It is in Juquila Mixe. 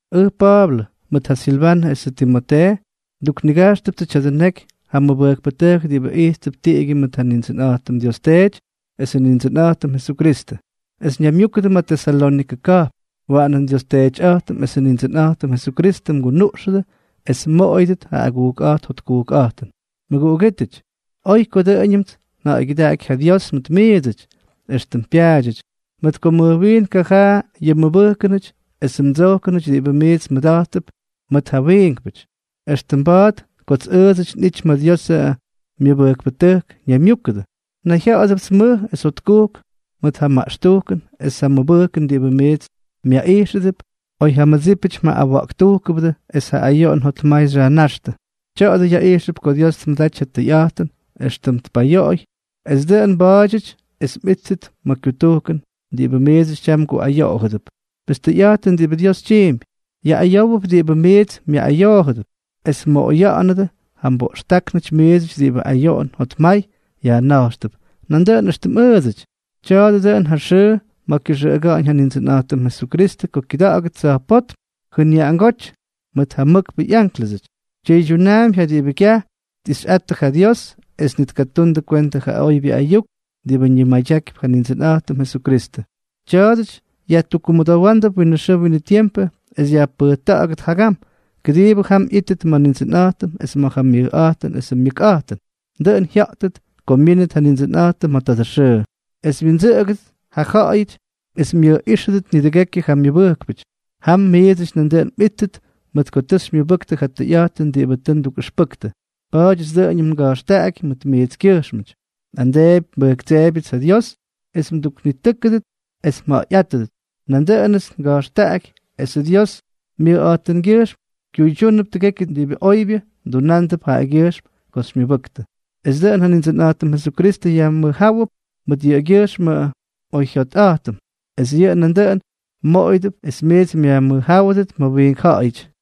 Ʉj Pa̱a̱blʉ, mʉt ja Silvanʉ esʉ Timotee. Nduknigajxtʉptsʉ tya̱dʉ neky ja mʉbʉjkpʉtʉjk diꞌibʉ ijttʉp tiꞌigyʉ mʉt ja Nindsʉnꞌa̱jtʉm Dios Teety esʉ Nindsʉnꞌa̱jtʉm Jesukristʉ, es ñaymyúkʉdʉ ma̱ Tesalónikʉ ka̱jpn. Waꞌanʉ nDios Teetyꞌa̱jtʉm esʉ Nindsʉnꞌa̱jtʉm Jesukristʉ mgunuꞌxʉdʉ es mmoꞌoyʉdʉt ja agujkꞌa̱jt jotkujkꞌa̱jtʉn. Mʉguꞌugítʉty, oy ko dʉꞌʉñʉmts nja̱ꞌa̱ygyʉdaꞌaky ja Dios mʉt miidsʉty, éxtʉm pyaadyʉty, mʉt ko mʉj wiin kajaa yʉ mmʉbʉjkʉnʉty esʉ mdsojkʉnʉty diꞌibʉ miits mmʉda̱jttʉp mʉt ja wiinkpʉty. Extʉm mba̱a̱t kots ʉʉdsʉty nꞌity ma̱ Diosʉ myʉbʉjkpʉtʉjk ñaymyúkʉdʉ, nayjya̱ꞌa̱dʉpts mʉj es jotkujk mʉt ja maꞌxtujkʉn es ja mʉbʉjkʉn diꞌibʉ miits myaꞌijxʉdʉp, oy ja mmʉdsípʉty mjaꞌꞌawa̱ꞌktujkʉbʉdʉ es ja ayoꞌon jotmay xyajnáxtʉ. Tya̱a̱dʉ yaꞌijxʉp ko Dios tmʉdaty ja tʉyꞌa̱jtʉn éxtʉm tpayoꞌoy es dʉꞌʉn mba̱a̱dyʉty es mꞌíttʉt ma̱ kyutujkʉn, diꞌibʉ miidsʉty tyam mguꞌayoꞌodʉp. Pes tʉyꞌa̱jtʉn diꞌibʉ Dios tyiimpy; yaꞌꞌayówʉp diꞌibʉ miits myaꞌꞌayoojʉdʉp, es mmoꞌoya̱ꞌa̱nʉdʉ ja mboꞌxtáknʉty miidsʉty diꞌibʉ ayoꞌon jotmay yajna̱jxtʉp, nandʉꞌʉn éxtʉm ʉʉdsʉty. Tya̱a̱dʉ dʉꞌʉn ja xʉʉ ma̱ kyʉxʉꞌʉga̱ꞌa̱ñ ja Nindsʉnꞌa̱jtʉm Jesukristʉ ko kyʉda̱ꞌa̱gʉt tsa̱jpótm jʉnyaꞌangóty mʉt ja mʉkpʉ ꞌyánklʉsʉty. Tyʉydyunaampy ja diꞌibʉ kyaj tꞌixꞌattʉ ja Dios es ni tkatundʉ kwentʉ ja oybyʉ ayuk diꞌibʉ ñimadyakypy ja Nindsʉnꞌa̱jtʉm Jesukristʉ. Tya̱a̱dʉty yajtukkumʉdowándʉp winʉ xʉʉ winʉ tiempʉ es yajpʉjta̱ꞌa̱gʉt jagam, kʉdiibʉ jam ꞌyíttʉt ma̱ Nindsʉnꞌa̱jtʉm es ma̱ ja myʉjꞌa̱jtʉn esʉ myʉkꞌa̱jtʉn. Dʉꞌʉn jyátʉt ko myínʉt ja Nindsʉnꞌa̱jtʉm ma̱ tadʉ xʉʉ, es wyindsʉꞌʉgʉdʉt ja jyaꞌayʉty es myʉjꞌíxʉdʉt nidʉgekyʉ ja myʉbʉjkpʉty. Jam miidsʉty nandʉꞌʉn mꞌíttʉt mʉt ko tʉ xymyʉbʉktʉ ja tʉyꞌa̱jtʉn diꞌibʉ tʉ ndukꞌʉxpʉktʉ. Pa̱a̱dyʉts dʉꞌʉñʉm nga̱jxtaꞌaky mʉt miitskyʉjxmʉty, nꞌamdeepy nbʉjktseebyʉts ja Dios es mduknitʉ́kʉdʉt es mja̱ꞌa̱yꞌátʉdʉt. Nandʉꞌʉnʉts nga̱jxtaꞌaky esʉ Dios myʉkꞌa̱jtʉngyʉjxm kyuydyúnʉp tʉgekyʉ diꞌibʉ oybyʉ mdunándʉp jaꞌagyʉjxm ko xymyʉbʉktʉ, es dʉꞌʉn ja Nindsʉnꞌa̱jtʉm Jesukristʉ yajmʉjjáwʉp mʉt yʉꞌʉgyʉjxmʉ mꞌoyjyikyꞌa̱jtʉn, es yʉꞌʉ nandʉꞌʉn mmoꞌoyʉdʉp es miits myajmʉjjáwʉdʉt ma̱ wiink ja̱ꞌa̱yʉty.